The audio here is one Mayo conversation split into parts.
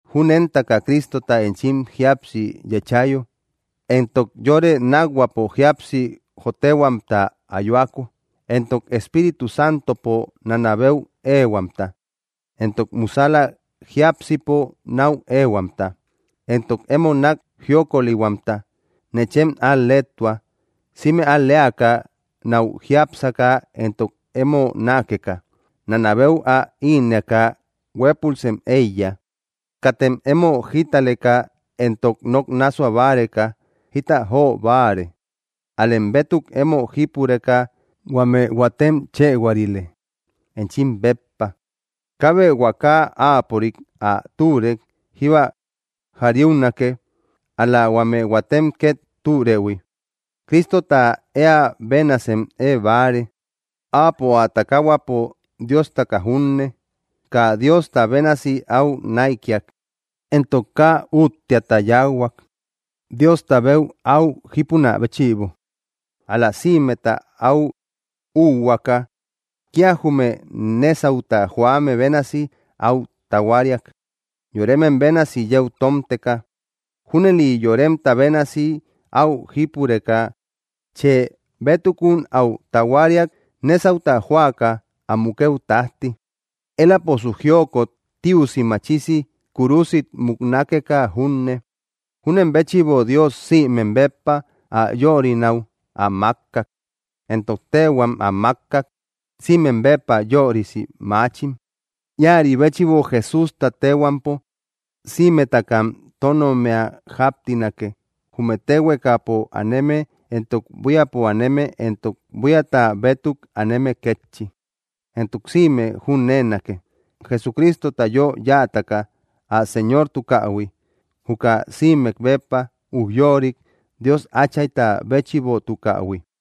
Júnentaka Cristota enchim jíapsi yéchayo, entok yore nákhuäpo jíapsi jotehuamta ayuako, entok Espíritu Santopo nanabeu éehuamta, entok musäla jiápsipo náu éehuamta, entok emo nák jiokolihuamta, nechem al‑leetua, sïme al‑leaka náu jiápsaka entok emo nákeka. Nanabeu ä innëaka huépulsem éiya. Katem emo jítaleka entok nok nássua báreka jita jo báare; ál‑lem bétuk emo jípureka huame huatem chëhuarile, enchim béppa. Kaabe huaka áapörik ä türëu jíba jariunake, ál‑la huame huatem két türëhui. Cristota eä benasem eebáare. Áapo ä takahuapo Diostaka junne, kaa Diosta bénasi áu näikiak, entok kaa úttiata yáuhuak, Diostabeu áu jípunä béchïbo. Ál‑la sïmeta áu úuhuaaka, kía jume nésauta joame bénasi áu tahuariak, yoremem bénasi yeu tómteka. Júnëli yoremta bénasi áu jípureka, chë bétukun áu tahuariak, nésauta joaka ä mukëu tájti, éläposu jiokot tiusi machisi kúrusit muknakeka junne. Júnen béchïbo Dios sïmem béppa ä yörinäu ä mákkak, entok téhuam ä mákkak, sïmem béppa yörisi maachim. Íäri béchïbo Jesústa téhuampo sïmetakam tónommia jáptinake, jume téhuekapo aneme entok buíapo aneme entok buíata bétuk aneme kétchi. Entok sïme nokpo nokame ä jüneeriotebonake, Jesucristota yö yáataka ä Señortukähui, juka sïmek béppa ujyorik Dios Áchayta béchïbotukähui.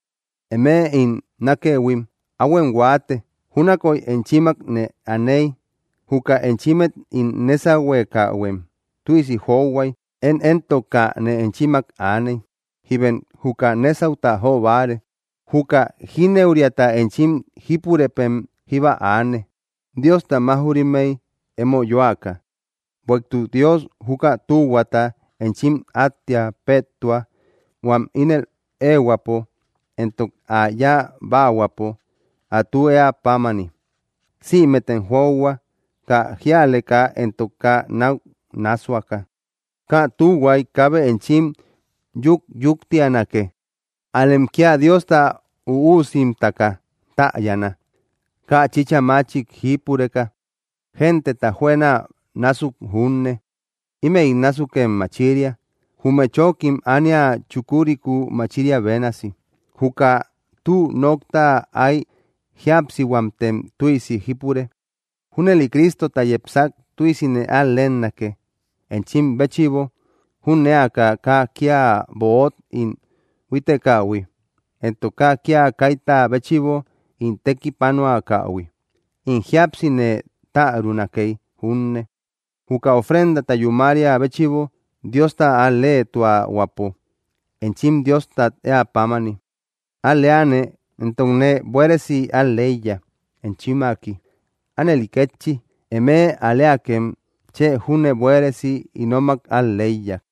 Eme ín nákëhuim, áhuem huáate: júnakoy enchimmak nee aney, juka enchimmet ín nésahuekähuem tüisi johuay. Én éntok kaa nee enchimmak aney, jíbem juka nésauta jo báare. Juka jínëuriata enchim jípurëpem jíba aane, Diosta máuj‑rimmey emo yoaka. Bueïtuk Dios juka tühuata enchim áttia péetua huam ínel éehuäpo entok ä yáa báahuäpo, ä tü éä pámani. Sïmetem johua, kaa jíaleka entok kaa náu nássuaka. Kaa tühuay kaabe enchim yukyuktianake; ál‑lem kía Diosta üusimtaka täyana, kaa chïcha machik jípureka, genteta juëna násuk junne. Ímëi násukem machiria, jume chókim ánia chukuriku machiriä bénasi. Juka tü nokta áy jíapsihuamtem tüisi jípure. Júnëli Crístota yepsak tüisine al‑leenake, enchim béchïbo, jünéaka kaa kía böot ín búitekähui, entok kaa kía kaita béchïbo ín tekipanuakähui. In jíapsi nee tärunakey junne, juka ofrendata yúmaria béchïbo Diosta al‑leetuahuäpo, enchim Diostat éä pámani, al‑leane, entokne buéresi al‑leiya, enchimmaki. Ánëli kétchi, eme al‑leakem chë júne buéresi ínomak al‑leiya.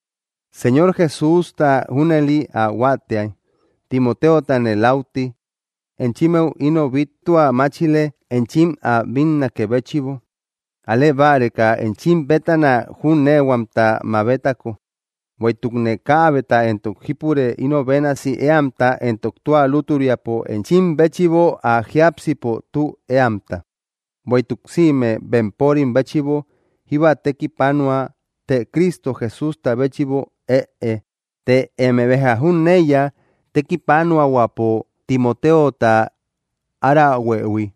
Señor Jesústa junëli ä huáatiay, Timoteotane läuti enchimmeu ino bíttua máchile enchim ä bínnakë béchïbo, al‑lee báreka enchim bétana jüneehuamta mabetako. Bueïtukne kaabeta éntok jípure ino bénasi éamta éntok tua lútüriapo enchim béchïbo ä jiápsipo tü éamta; bueïtuk sïme bempörim béchïbo jíba tekipanua, të Cristo Jesústa béchïbo ëe. Të eme béja jüneiya tekipanuahuäpo Timoteota árahuëhui,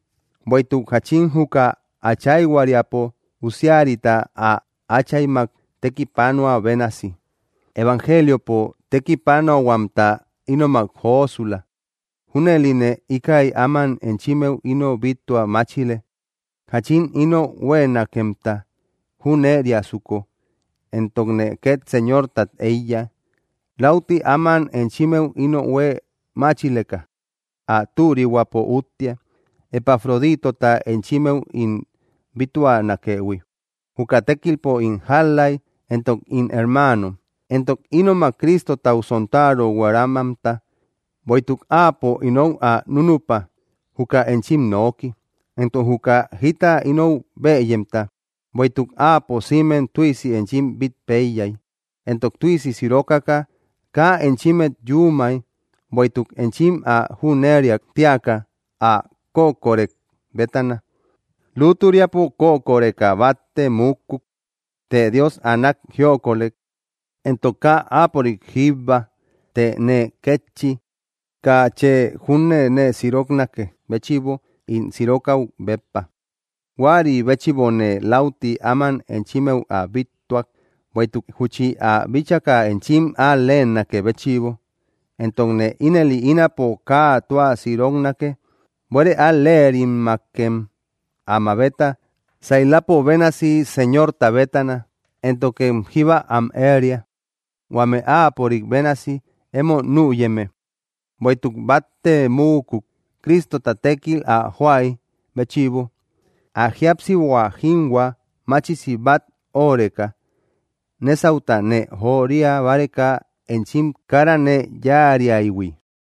bueïtuk jáchin juka áchayhuariapo usiarita ä áchaymak tékipanuä bénasi, evangeliopo, tekipanuahuamta ínomak josula. Júnëline íkäi áman enchimmeu ino bíttua máchile, jáchin inou huéenakemta jüneriasuko. Entokne két Señortat éiya, läuti áman enchimmeu ino huée máchileka. Ä türihuäpo úttia, Epafroditota enchimmeu ín bíttuanakëhui, juka tékilpo ín jál‑läi, entok ín hermaano, entok ínomak Cristotau sontaro hueramamta; bueïtuk áapo inou ä núnüpa, juka enchim nooki, entok juka jita inou bëyemta. Bueïtuk áapo sïmem tüisi enchim bít péiyay, entok tüisi sirokaka kaa enchimmet yuumay, bueïtuk enchim ä jüneriak tíaka ä kökorë bétana. Lútüriapo kökoreka batte muukuk; të Dios ä nák jiokolek, entok kaa áapörik jíbba, të nee kétchi, kaa chë júne nee siroknakë béchïbo ín sirokäu béppa. Huäri béchïbone läuti áman enchimmeu ä bíttuak, bueïtuk júchi ä bíchaka enchim al‑leenakë béchïbo; entokne ínëli ínapo kaa tua siroknake. Buére al‑lerimmakem ä mabeta, sailapo bénasi Señorta bétana, éntokem jíba am éria, huame áapörik bénasi emo nüyeme. Bueïtuk batte muukuk, Cristota tékil ä joaï béchïbo, ä jíapsihua jinhua machisi bat öoreka, nésauta nee joria báreka enchim kara nee yáariaïhui.